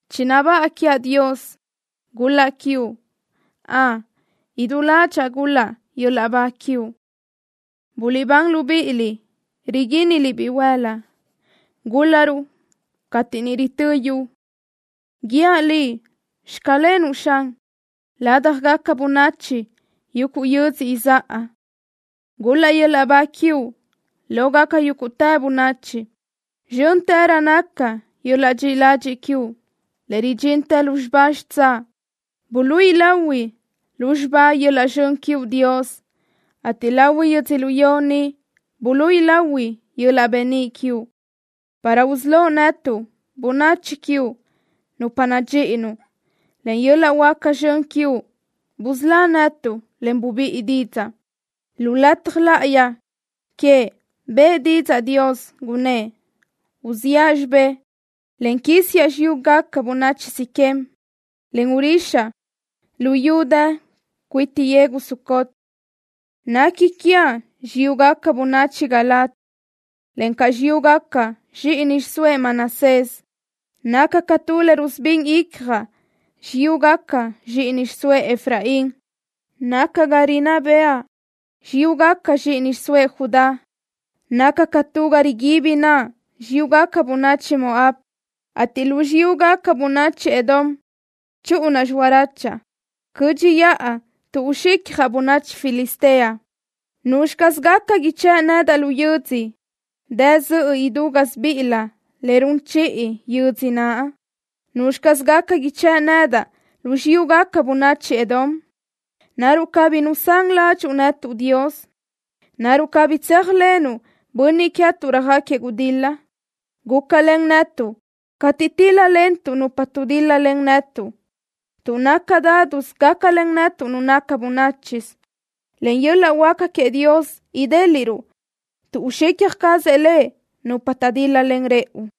¡Chinabáʼa quiaʼ, Dios! ¡Gul-laʼ quiuʼ! ¡Ön, idú ládxaʼa gul-laʼ yöl-laʼ ba quiuʼ! ¡Guliʼbán, libíʼiliʼ riguínnaliʼ bihuël-la! ¡Gúl-laruʼ cateʼ niʼ ritö́ yu! ¡Guíaʼ Liʼ: “Xclenuʼ” Xan, ládjagaca bönachi yuguʼ yödzö izáʼa! ¡Gul-laʼ yöl-laʼ ba quiuʼ lógaca yúguʼtë bönachi! ¡Zxö́ntërö naca yöl-laʼ dxiʼi ladxiʼ quiuʼ, le ridxintë lúzxiba xitsáʼ! Buluíʼi lahui lúzxiba yöl-laʼ zxön quiuʼ, Dios, ateʼ lahui yödzölió ni buluíʼi lahui yöl-laʼ beníʼ quiuʼ, para usölóʼ netuʼ, bönachi quiuʼ, nupa nadxíʼinuʼ. Len yöl-laʼ huáca zxön quiuʼ busölá netuʼ, en bubíʼi didzaʼ. Lu lataj láʼayi queëʼ bëʼë didzaʼ Dios, gunnë́ʼ: “Uziʼa xibé, en quísiaʼ xiyúgaca bönachi Siquem, en urixaʼ luyú dë cuiti yegu Sucot. Nequi quiaʼ xiyúgaca bönachi Galaad, encaʼ xiyúgaca zxíʼini xiʼsóëʼ Manasés. Naca ca tu le rusubín icjaʼ xiyúgaca zxíʼini xiʼsóëʼ Efraín. Naca ga rinná bëʼa xiyúgaca zxíʼini xiʼsóëʼ Judá. Naca ca tu ga riguibi naʼa xiyúgaca bönachi Moab, ateʼ lu xiyúgaca bönachi Edom chúʼunaʼ lölaʼ. Cö́dxiʼa tuʼ uxicjaʼ bönachi Filistea.” ¿Nuzxi caz gaca ichë́ʼ nedaʼ lu yödzö dë zöʼö idú gásibiʼilö le run chiʼi yödzö naʼ? ¿Nuzxi caz gaca ichë́ʼ nedaʼ lu xiyúgaca bönachi Edom? ¿Naruʼ cabí nusán ládxuʼu netuʼ, Dios? ¿Naruʼ cabí tséajlenuʼ bönniʼ queë́tuʼ röjáquiëʼ gudil-la? Gúcalen netuʼ cateʼ tíl-lalentuʼ nupa dutíl-lalen netuʼ, tuʼ naca dádusö gácalen netuʼ nu naca bönáchisö. Len yöl-laʼ huáca queëʼ Dios idéliʼruʼ tuʼ uxicja cazëʼ Lëʼ nupa taʼdíl-lalen rëʼu.